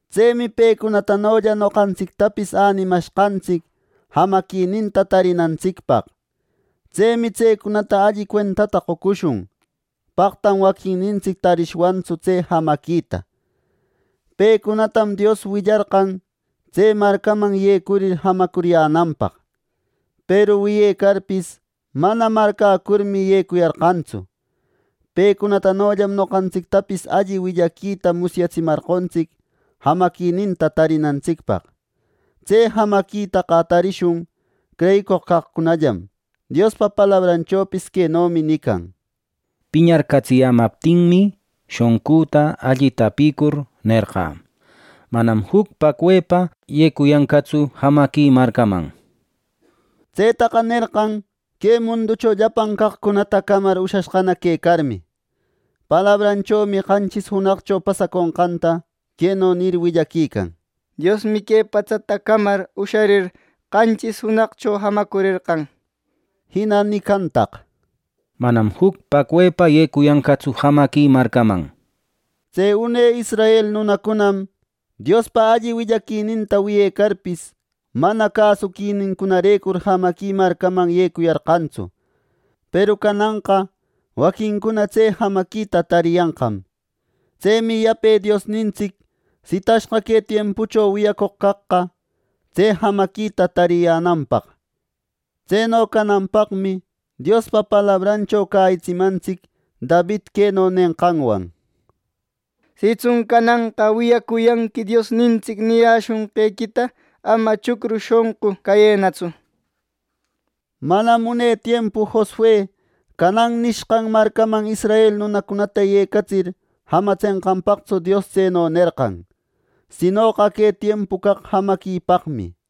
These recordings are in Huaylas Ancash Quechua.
Tsemi pecunatanolla noqantsictapis änimashqantsic jamaquininta tarinantsicpaq. Tsemi tsecunata alli cuentata qocushun, paqtam waquinnintsic tarishwantsu tse jamaquita. Pecunatam Dios willarqan tse marcaman yecurir jamacuriyänanpaq; peru wiyecarpis, mana marcäcurmi yecuyarqantsu. Pecunatanollam noqantsictapis alli willaquita musyatsimarqontsic jamaquininta tarinantsicpaq. Tse jamaquitaqa tarishun creyicoq caqcunallam. Diospa palabranchopis quenomi nican: “Piñarcatsiyämaptinmi, shonqüta alli tapïcur nerqä: ‘Manam juc paqwepa yecuyanqatsu jamaqui marcaman’” nir. Tsetaqa nerqan que munducho llapan caqcunata camar ushashqana quecarmi. Palabranchomi qanchis junaqcho pasaconqanta queno nir willaquican: “Diosmi que patsata camar usharir, qanchis junaqcho jamacurerqan” nir. Jina nicantaq: “Manam juc paqwepa yecuyanqatsu jamaqui marcäman” nir. Tse une israel nunacunam Diospa alli willaquininta wiyecarpis, mana cäsuquinincunarecur jamaqui marcaman yecuyarqantsu. Peru cananqa waquincuna tse jamaquita tariyanqam. Tsemi yape Diosnintsic sitashqa que tiempucho wiyacoq caqqa, tse jamaquita tariyänanpaq. Tseno cananpaqmi Diospa palabrancho cäyitsimantsic David queno nenqanwan: “Sitsun cananqa wiyacuyanqui Diosnintsic niyäshonqequita ama chucru shonqu cayënatsu” nir. Manam une tiempu Josue “Caanan” nishqan Marcaman israel nunacunata yecatsir jamatsenqanpaqtsu Dios tseno nerqan, sinoqa que tiempu caq jamaquipaqmi.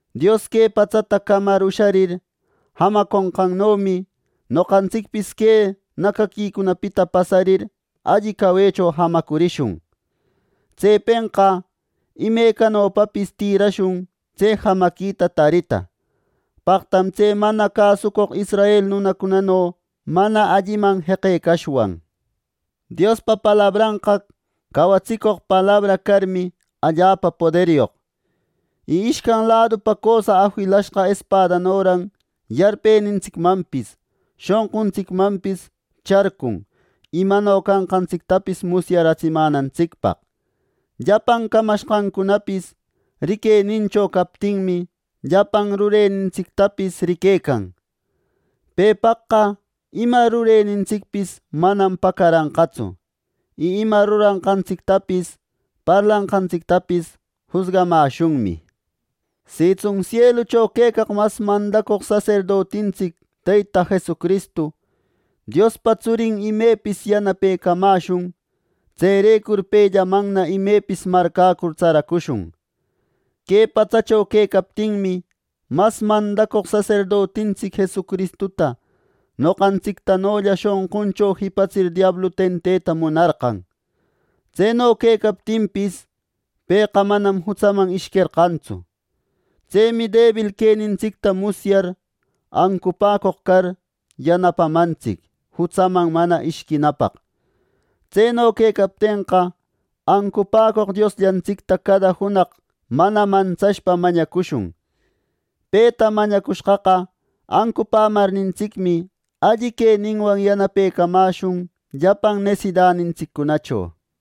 Dios que patsata camar usharir, jamanqannomi noqantsicpis que nacaquicunapita pasarir alli cawecho jamacurishun. Tsepenqa imecanopapis tïrashun tse jamaquita tarita. Paqtam tse mana cäsucoq israel nunacunano mana alliman jeqecashwan. Diospa palabranqa cawatsicoq palabra carmi, allapa poderyoq. Y ishcan ladupa cösa afilashqa espadanoran yarpenintsicmanpis, shonquntsicmanpis charcun imano canqantsictapis musyatsimänantsicpaq. Llapan camashqancunapis riquenincho captinmi, llapan rurenintsictapis riquecan. Pepaqqa ima rurenintsicpis manam pacaranqatsu. Y ima ruranqantsictapis parlanqantsictapis jusgamäshunmi. Sitsun sielucho quecaq mas mandacoq saserdotintsic Teyta Jesucristu, Diospa Tsurin, imepis yanapecamäshun. Tserecur pellamanna imepis marcäcur tsaracushun. Que patsacho quecaptinmi, mas mandacoq saserdotintsic Jesucristuta noqantsictanolla shonquncho jipatsir diablu tenteta munarqan. Tseno quecaptinpis, pëqa manam jutsaman ishquerqantsu. Tsemi debil quenintsicta musyar, ancupäcoq car, yanapamantsic jutsaman mana ishquinapaq. Tseno quecaptenqa, ancupäcoq Diosllantsicta cada junaq mana mantsashpa mañacushun. Peta mañacushqaqa ancupämarnintsicmi, alli queninwan yanapecamäshun llapan nesidanintsiccunacho.